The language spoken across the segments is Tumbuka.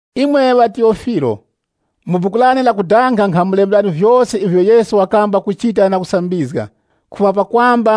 Imwe ŵaTiyofilo, Mu buku lane lakudanga nkhamulemberani vyose ivyo Yesu wakamba kuchita na kusambizga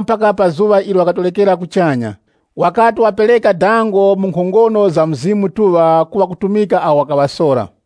mpaka pa zuŵa ilo wakatorekera kuchanya, wakati wapereka dango mu nkhongono za Mzimu Mutuŵa ku ŵakutumika awo wakaŵasora.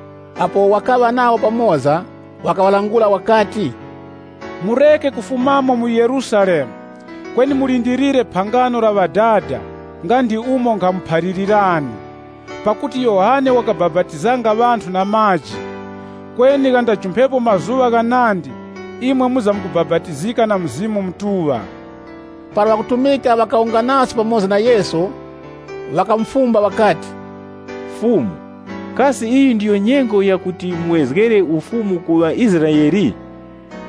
Apo wakaŵa nawo pamoza, wakaŵalangula wakati, “Mureke kufumamo mu Yerusalemu, kweni mulindilire phangano la Ŵadada nga ndi umo nkhamuphalirani. Pakuti Yohane wakabapatizanga ŵanthu na maji, kweni ghandajumphepo mazuŵa ghanandi, imwe mwizamkubapatizika na Mzimu Mutuŵa.” Para ŵakutumika ŵakawunganaso pamoza na Yesu, ŵakamufumba ŵakati, “Fumu, kasi yeneiyi ndiyo nyengo yakuti muwezgere ufumu ku ŵaIsraele?”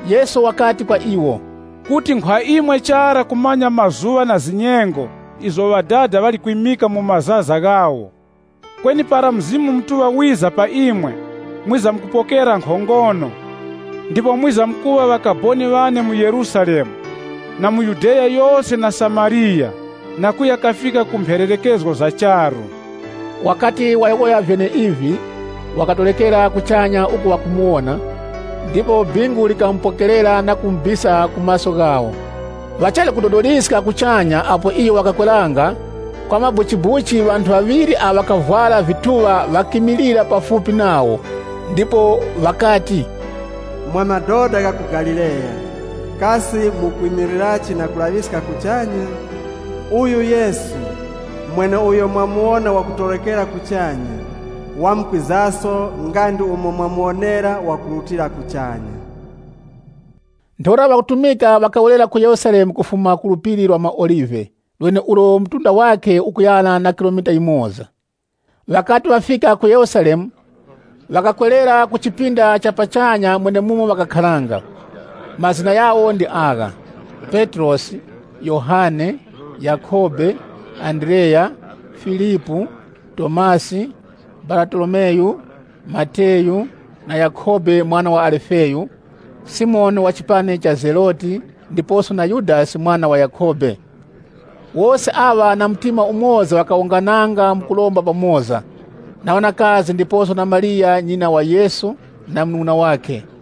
Yesu wakati kwa iwo, “Kuti nkhwa imwe chara kumanya mazuŵa na zinyengo izo Ŵadada ŵali kwimika mu mazaza ghawo. Kweni para Mzimu Mutuŵa wiza pa imwe, mwizamkupokera nkhongono, ndipo mwizamkuŵa ŵakaboni ŵane mu Yerusalemu, mu Yudeya yose na Samariya, na kuya kafika ku mphererekezgo za charu.” Wakati wayowoya vyeneivi, wakatorekera kuchanya uku ŵakumuwona, ndipo bingu likamupokerera na kumubisa ku maso ghawo. Ŵachali kudodoliska kuchanya apo iyo wakakweranga, kwa mabuchibuchi ŵanthu ŵaŵiri awo ŵakavwara vituŵa ŵakimilira pafupi nawo. Ndipo ŵakati, “Mwa madoda gha ku Galileya, kasi mukwimilirachi na kulaŵiska kuchanya? Uyu Yesu, mweneuyo mwamuwona wakutorekera kuchanya, wamkwizaso nga ndi umo mwamuwonera wakurutira kuchanya.” Ntheura ŵakutumika ŵakawerera ku Yerusalemu kufuma ku Phiri la maOlive, lweneulo mtunda wakhe ukuyana na kilomita yimoza. Ŵakati ŵafika mu Yerusalemu, ŵakakwerera mu chipinda cha pachanya mwenemumo ŵakakharanga. Mazina ghawo ndi agha: Petrosi Yohane, Yakhobe, Andreya, Filipu, Tomasi, Baratolomeyu, Mateyu, na Yakhobe mwana wa Alifeyu, Simoni wa chipani cha Zeloti ndiposo na Yudasi mwana wa Yakhobe. Wose aŵa na mtima umoza ŵakawungananga mukuromba pamoza, na ŵanakazi ndiposo na Mariya nyina wa Yesu na ŵanung'una ŵakhe.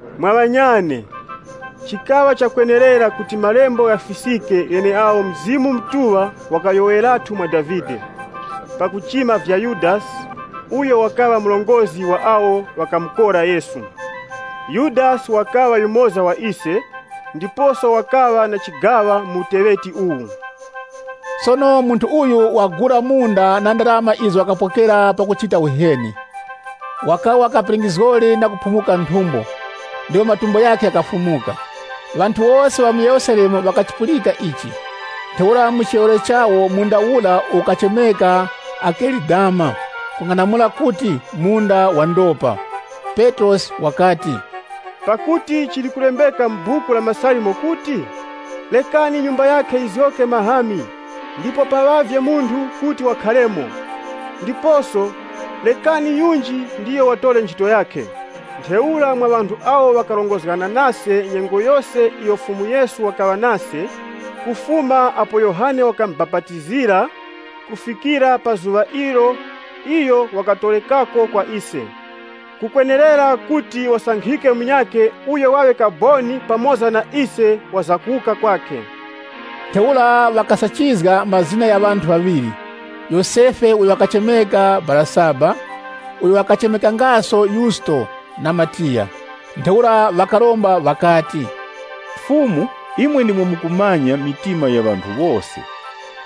“Mwa ŵanyane, chikaŵa chakwenerera kuti malembo ghafiskike gheneagho Mzimu Mutuŵa wakayowoyerathu mwa Davide, pakuchima vya Yudasi, uyo wakaŵa murongozgi wa awo ŵakamukora Yesu. Yudasi wakaŵa yumoza wa ise, ndiposo wakaŵa na chigaŵa mu uteŵeti uwu.” Sono munthu uyu wakagula munda na ndarama izo wakapokera pakuchita uheni. Wakawa kapingizgori na kuphumuka nthumbo ndipo matumbo ghakhe ghakafulumuka. Ŵanthu wose ŵa mu Yerusalemu ŵakachipulika ichi. Ntheura mu chiyowoyero chawo munda ura ukachemeka Akelidama, kung'anamula kuti, “Munda wa ndopa.” Petrosi wakati, “Pakuti chili kulembeka mu Buku la MaSalimo kuti, ‘Rekani nyumba yakhe yizgoke mahami, ndipo paŵavye munthu kuti wakharemo.’ Ndiposo, ‘Rekani yunji ndiyo watore nchito yakhe.’ “Ntheura mwa ŵanthu awo ŵakarongozgana nase nyengo yose iyo Fumu Yesu wakaŵa nase, kufuma apo Yohane wakamubapatizira kufikira pa zuŵa ilo iyo wakatorekako kwa ise, kukwenerera kuti wasankhike munyakhe uyo waŵe kaboni pamoza na ise wa kuwuka kwakhe.” Ntheura ŵakasachizga mazina gha ŵanthu ŵaŵiri: Yosefe uyo wakuchemeka Barasaba, uyo wakachemekangaso Yusto, na Matiya. Ntheura ŵakaromba ŵakati, “Fumu, imwe mukumanya mitima ya ŵanthu wose,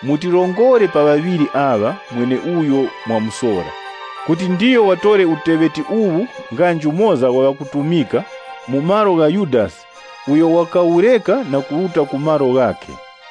mutirongore pa ŵaŵiri aŵa mweneuyo mwamusora, kuti ndiyo watore uteŵeti uwu nga njumoza wa ŵakutumika, mu malo mwa Yudasi uyo wakawureka na kuruta ku malo ghakhe.”